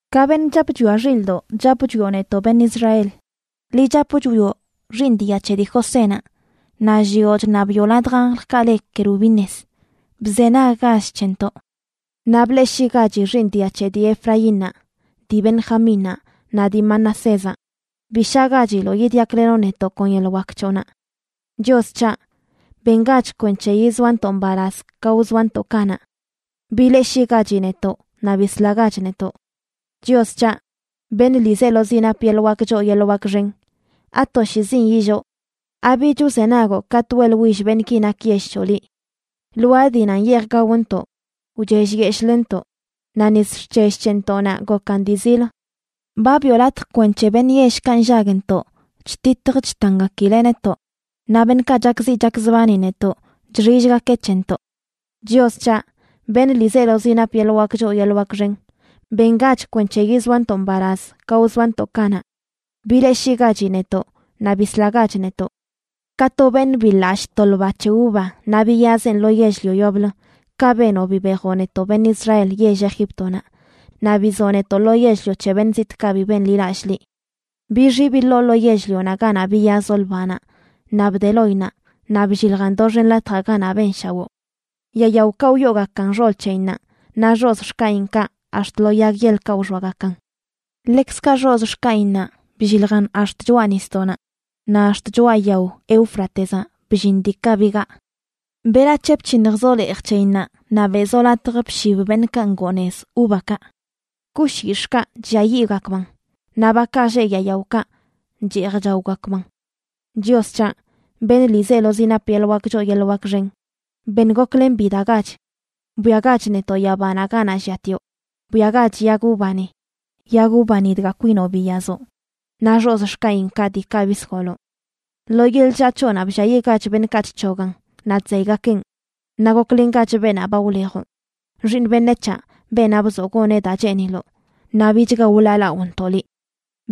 Ka beṉꞌ chap chwia xildoꞌ, chap chwioꞌ netoꞌ beṉꞌ Israel. Liꞌ chap chwioꞌ xiiṉ dia c̱he dii Josénaꞌ, naꞌ llioꞌ chṉabiꞌo ladj anjlkaꞌ le kerubines, bzenaggach c̱hentoꞌ, naꞌ bleꞌshiꞌgachi xiiṉ dia c̱he dii Efraínnaꞌ, dii Benjamínnaꞌ naꞌ dii Manasézaꞌ. Bi shagachiloꞌ yidyaklenoꞌ netoꞌ kon yeḻꞌ wak c̱hoꞌnaꞌ. Chios c̱haꞌ, ¡bengach kwenc̱he yizoanto mbalaz ka wzoanto kanaꞌ! ¡Bileꞌshiꞌgachi netoꞌ naꞌ bislagach netoꞌ! Chios c̱haꞌ, beṉꞌ ḻiizelozi nap yeḻꞌ wak choo yeḻꞌ wak xen, ¿atoshiizin illoo? ¿abich wzenagoꞌ katꞌ weꞌḻwill beṉꞌki nak yell c̱hoꞌ liꞌ? Lwaa dii nan yeej gaontoꞌ, wchellyeshꞌləntoꞌ, naꞌ nis xc̱hell c̱hentoꞌnaꞌ gokan dii zil. Ba biꞌo latj kwenc̱he beṉꞌ yellkaꞌ nllagntoꞌ chtitj chtangakileꞌ netoꞌ, naꞌ beṉꞌkaꞌ chakziꞌ chakzbani netoꞌ chxillgakeꞌ c̱hentoꞌ. Chios c̱haꞌ, beṉꞌ ḻiizelozi nap yeḻꞌ wak choo yeḻꞌ wak xen, ¡bengach kwenc̱he yizoanto mbalaz ka wzoanto kanaꞌ! ¡Bileꞌshiꞌgachi netoꞌ naꞌ bislagach netoꞌ! Ka to beṉꞌ biḻallꞌ to lba c̱he uva naꞌ biyazeꞌn lo yell-lio yoblə, kaꞌ benoꞌ bibejoꞌ netoꞌ beṉꞌ Israel yell Egíptonaꞌ, naꞌ bizoꞌ netoꞌ lo yell-lio c̱he beṉꞌ zitꞌkaꞌ bi benḻilallꞌ liꞌ. Bixi biḻoꞌ lo yell-lionaꞌ ganaꞌ biyazoꞌ ḻbanaꞌ, naꞌ bde loinnaꞌ naꞌ blliljan doxen latjaꞌ ganaꞌ benshawoo. Yaa yaokaꞌ wyoogakan xol c̱heyinnaꞌ, naꞌ xozꞌ xkaꞌinkaꞌ ax̱t lo yag yeḻkaꞌ wxoagakan. Ḻekzkaꞌ xozꞌ xkaꞌinnaꞌ blliljan ax̱t choꞌa nisdoꞌnaꞌ, naꞌ ax̱t choꞌa yao Éufratezaꞌ bllin diikaꞌ bigaa. ¿Berac̱he bc̱hiṉjzoꞌ leej c̱heyinnaꞌ naꞌ beꞌzoꞌ latj bshib beṉꞌkaꞌ ngoo nez uvakaꞌ? Kush yix̱ꞌkaꞌ chlliayiꞌgakbanꞌ; naꞌ bakaꞌ lleꞌ yaa yaokaꞌ cheej chaogakban. Chios c̱haꞌ, beṉꞌ ḻiizelozi nap yeḻꞌ wak choo yeḻꞌ wak xen; ben goklen bidagach. Bwiagach netoꞌ yabanaꞌ ganaꞌ lliatioꞌ; bwiagach yag uvani, yag uvani dga kwinoꞌ biyazoꞌ, naꞌ xozꞌ xkaꞌinkaꞌ diikaꞌ bisgoloꞌ. Lo yeḻꞌ chllaa c̱hoꞌnaꞌ blliayiꞌgach beṉꞌkaꞌ chc̱hogan naꞌ chzeygakeꞌn. Naꞌ goklengach beenaꞌ ba wlejoꞌ, xiiṉ beṉec̱haꞌ beenaꞌ bzoꞌ goneꞌ daa cheeniloꞌ, naꞌ bichga wḻaalaꞌonto liꞌ.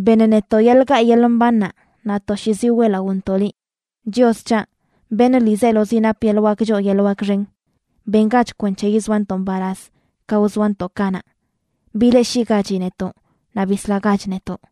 Beṉ netoꞌ yeḻꞌ gaꞌ yeḻꞌ mbannaꞌ naꞌ toshiizi weꞌlaꞌontoꞌ liꞌ. Chios c̱haꞌ, beṉꞌ ḻiizelozi nap yeḻꞌ wak choo yeḻꞌ wak xen, ¡bengach kwenc̱he yizoantoꞌ mbalaz ka wzoantoꞌ kanaꞌ! ¡Bileꞌshiꞌgachi netoꞌ naꞌ bislagach netoꞌ!